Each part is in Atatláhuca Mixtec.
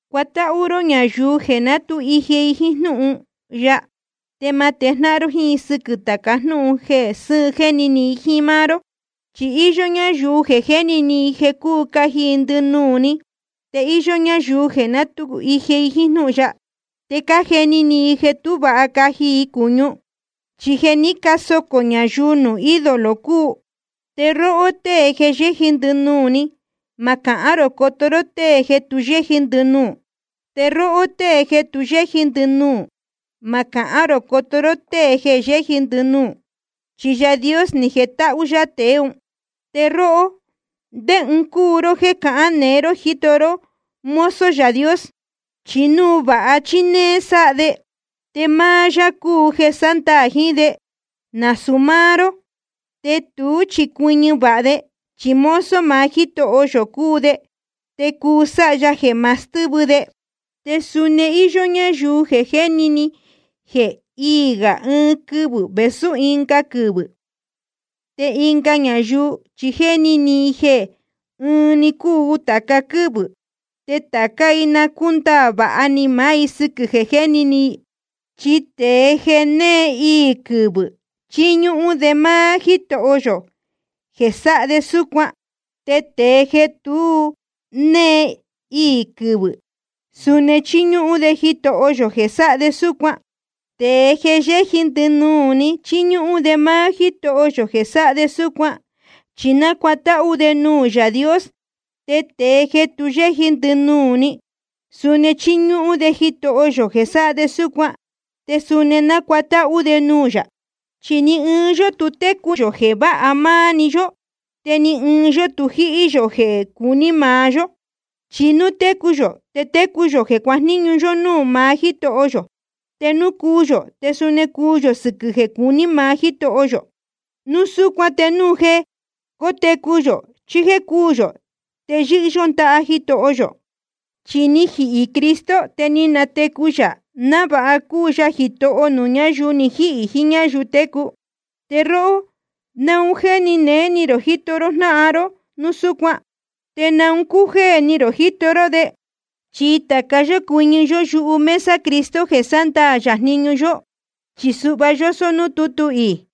Cuatáhú ró ñayuu jeē ná tu ije jíín jnúhun ya, te ma tejnáhan ró jíín i sɨquɨ̄ tāca jnúhun jeē sɨ́ɨn jéni ni i jíín máá ró. Chi íyó ñáyuu jeē jéni ni i jeē cúu caji i ndɨnuū‑ni. Te íyó ñáyuu jeē ná tu ije jíín jnúhun ya, te cájeni ni i jeē tú vāha caji i cūñu, chi jeē ní casocō ñayuu nuū ídolo cúu. Te róhó tée jeē yéji ndɨnuū‑ni, ma cahán rō coto ró tée jeē tu yéji ndɨnuū. Te róhó tée jeē tu yéji ndɨnuū, ma cahán rō coto ró tée jeē yéji ndɨnuū. Chi Yaā Dios ni jetáhú yá tēe ún. Te róhó, ¿ndé ɨɨn cúu ró jéē cahán neé ró jíto ró mozo Yaā Dios? Chi núu vāha chí néé sáha de, te máá yá cúu jeē sándaā jiín de, nasūu máá ró. Te tuú chi cuɨñɨ vāha de, chi mozo maá Jítoho yō cúu de, te cuu sáha ya jeē ma stɨ́vɨ de. Te suni íyó ñayuu jeē jéni ni jeē ií gā ɨɨn quɨvɨ̄ vēsú ɨnga quɨvɨ̄. Te ɨnga ñayuu chi jéni ni i jeē ɨnuú‑ni cúu tāca quɨ́vɨ̄. Te tācá i na cúndaā vāha ni maá i sɨquɨ̄ jeē jéni ni i. Chi tēe jeē née iī quɨvɨ̄, chíñúhún de máá Jítoho yō jeē sáha de súcuan. Te tēe jeē tu née iī quɨvɨ̄, suni chíñúhún de Jitoho yō jeē sáha de súcuan. Te tēe jeē yéji ndɨnuū‑ni, chíñúhún de máá Jítoho yō jeē sáha de súcuan, chi nácuatáhú de nuū Yaā Dios. Te tēe jeē tu yéji ndɨnuū, suni chíñúhún de Jitoho yō jeē sáha de súcuan, te suni nácuatáhú de nuū yā. Chi ni ɨɨn yó tu técu yō jeē váha máá‑ni yó, te ni ɨɨn yó tu jíhí yō jeē cuní maá yó. Chi núu técu yō, te técu yō jeē cuajníñu yó núū maá Jítoho yō. Te núu cuu yō, te suni cuu yō sɨquɨ̄ jeē cuní maá Jítoho yō. Núu súcuan te núu jeē cótecu yō chí jéē cuu yō, te yɨ́hɨ yó ndaha Jítoho yō. Chi ni jihī Cristo te ni natecu yā, návāha cuu ya Jitoho nuū ñáyuu ni jíhī jiín ñáyuu técu. Te róhó, ¿naun jéni néé ni rō jíto ró jnáhan ró núu súcuan? ¿Te naun cújéē ni rō jíto ró de? Chi tāca yó cuɨñɨ yó yuhu mesa Cristo jeē sándaā yā jniñu yó. Chi suhva yósó núū tútu iī: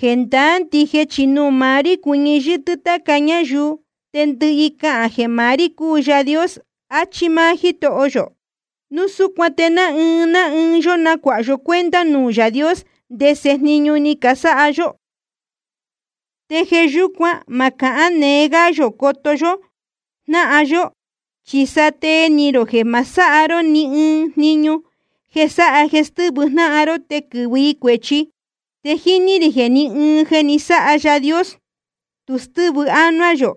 Jendaá ndije chi nuū maá rí cuɨñɨ yɨ́tɨ́ táca ñáyuu, te ndɨhɨ i cahān jeē maá rí cúu Yaā Dios, áchí máá Jítoho yō. Núu súcuan te ná ɨɨn ná ɨɨn yó nacuāha yo cuenta nuū Yaā Dios ndese jniñu ni casáha yó. Te jeē yúcuan ma cahán neé gá yō coto yó jnáhan yó. Chi sa tee ni rō jeē ma sáha ró ni ɨɨn jniñu jeē sáha jeē stɨ́vɨ jnáhan ró te quɨ̄vɨ i cuēchi. Te jíní rī jeē ni ɨɨn jeē ni sáha Yaā Dios, tu stɨ́vɨ ánuá yō.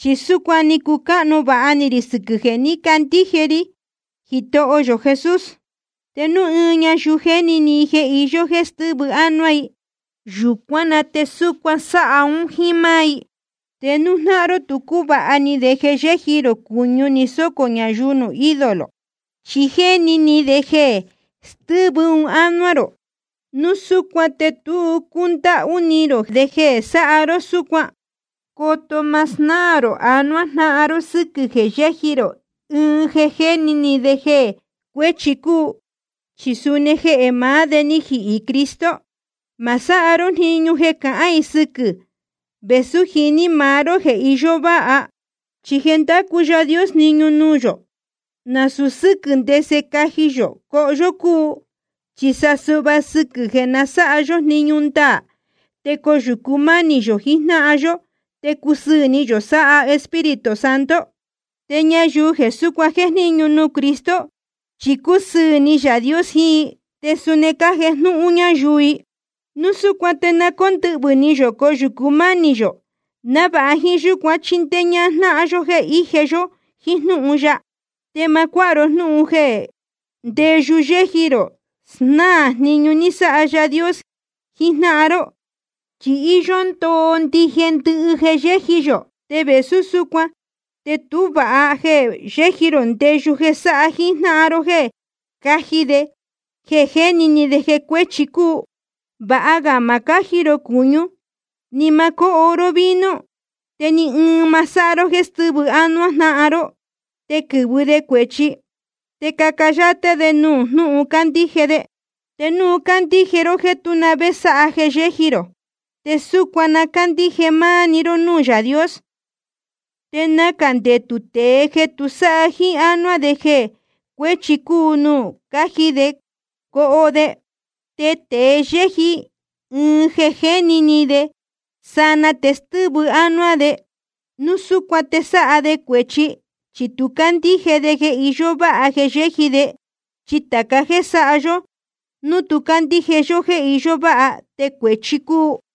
Chi súcuan ni cucáhnu vāha ni rī sɨquɨ̄ jeē candíje ri Jitoho yō Jesús. Te núu ɨɨn ñayuu jéni ni i jeē iyó jéē stɨ́vɨ ánuá i, yūcuán na te súcuan sáha un jíín máá i. Te núu jnáhan ró tu cúvāha ni de jeē yéji rō cūñu ni casocō ñayuu nuū ídolo, chi jéni ni de jeē stɨ́vɨ un ánuá rō, núu súcuan te tu cúndáhú ni rō de jeē sáha ró súcuan. Coto má snáā rō anuá jnáhan ró sɨ́quɨ̄ jeē yéji rō ɨɨn jeē jéni ni de jeē cuēchi cúu. Chi suni jehē maá de ni jihī Cristo. Ma sáha ró jniñu jeē cahán i sɨquɨ̄, vēsú jiní maá ró jeē iyó váha. Chi jeē ndácu Yaā Dios jniñu nuū yō, nasūu sɨ́quɨ̄ ndese caji yō coho yó cúu, chi sa suhva sɨquɨ̄ jeē na sáha yó jniñu ndaā, te coyūcu mánī yō jiín jnáhan yó, te cusɨɨ̄ ni yō sáha Espíritu Santo. Te ñayuu jeē súcuan jéjníñu nuū Cristo, chi cúsɨɨ̄ ni Yaā Dios jiín i, te suni cájejnúhún ñáyuu i. Núu súcuan te na cóndɨhvɨ̄ ni yō coyūcu mánī yō, návāha jíín yúcuan chindéé ñájnáhan yó ije yó jíín jnúhun ya. Te ma cuáha ró jnúhun jeē ndeyu yéji rō snáā jniñu ni sáha Yaā Dios jiín jnáhan ró. Chi íyó ndoo ndije ndɨhɨ jeē yéji yō, te vēsú súcuan te tú vāha jeē yéji rō ndeyu jeē sáha jíín jnáhan ró jéē caji de jeē jéni ni de jeē cuēchi cúu. Vāha ga ma cáji rō cūñu, ni ma cóho ró vino, te ni ɨɨn ma sáha ró jéē stɨ́vɨ ánuá jnáhan ró, te quɨ̄vɨ de cuēchi, te caca yátá de nuū jnúhun cándíje de. Te núu cándíje ró jéē tú na vé sáha jeē yéji rō, te súcuan na cándíje máá‑ni ró núū Yaā Dios. Te nacā ndetū tēe jeē tu sáha jíín ánuá de jeē cuēchi cúu núu caji de coho de. Te tēe yéji ɨɨn jeē jéni ni de sanaa te stɨ́vɨ ánuá de, núu súcuan te sáha de cuēchi, chi tu cándíje de jeē iyó váha jeē yéji de. Chi tāca jéē sáha yó, núu tu cándíje yó jéē iyó váha, te cuēchi cúu.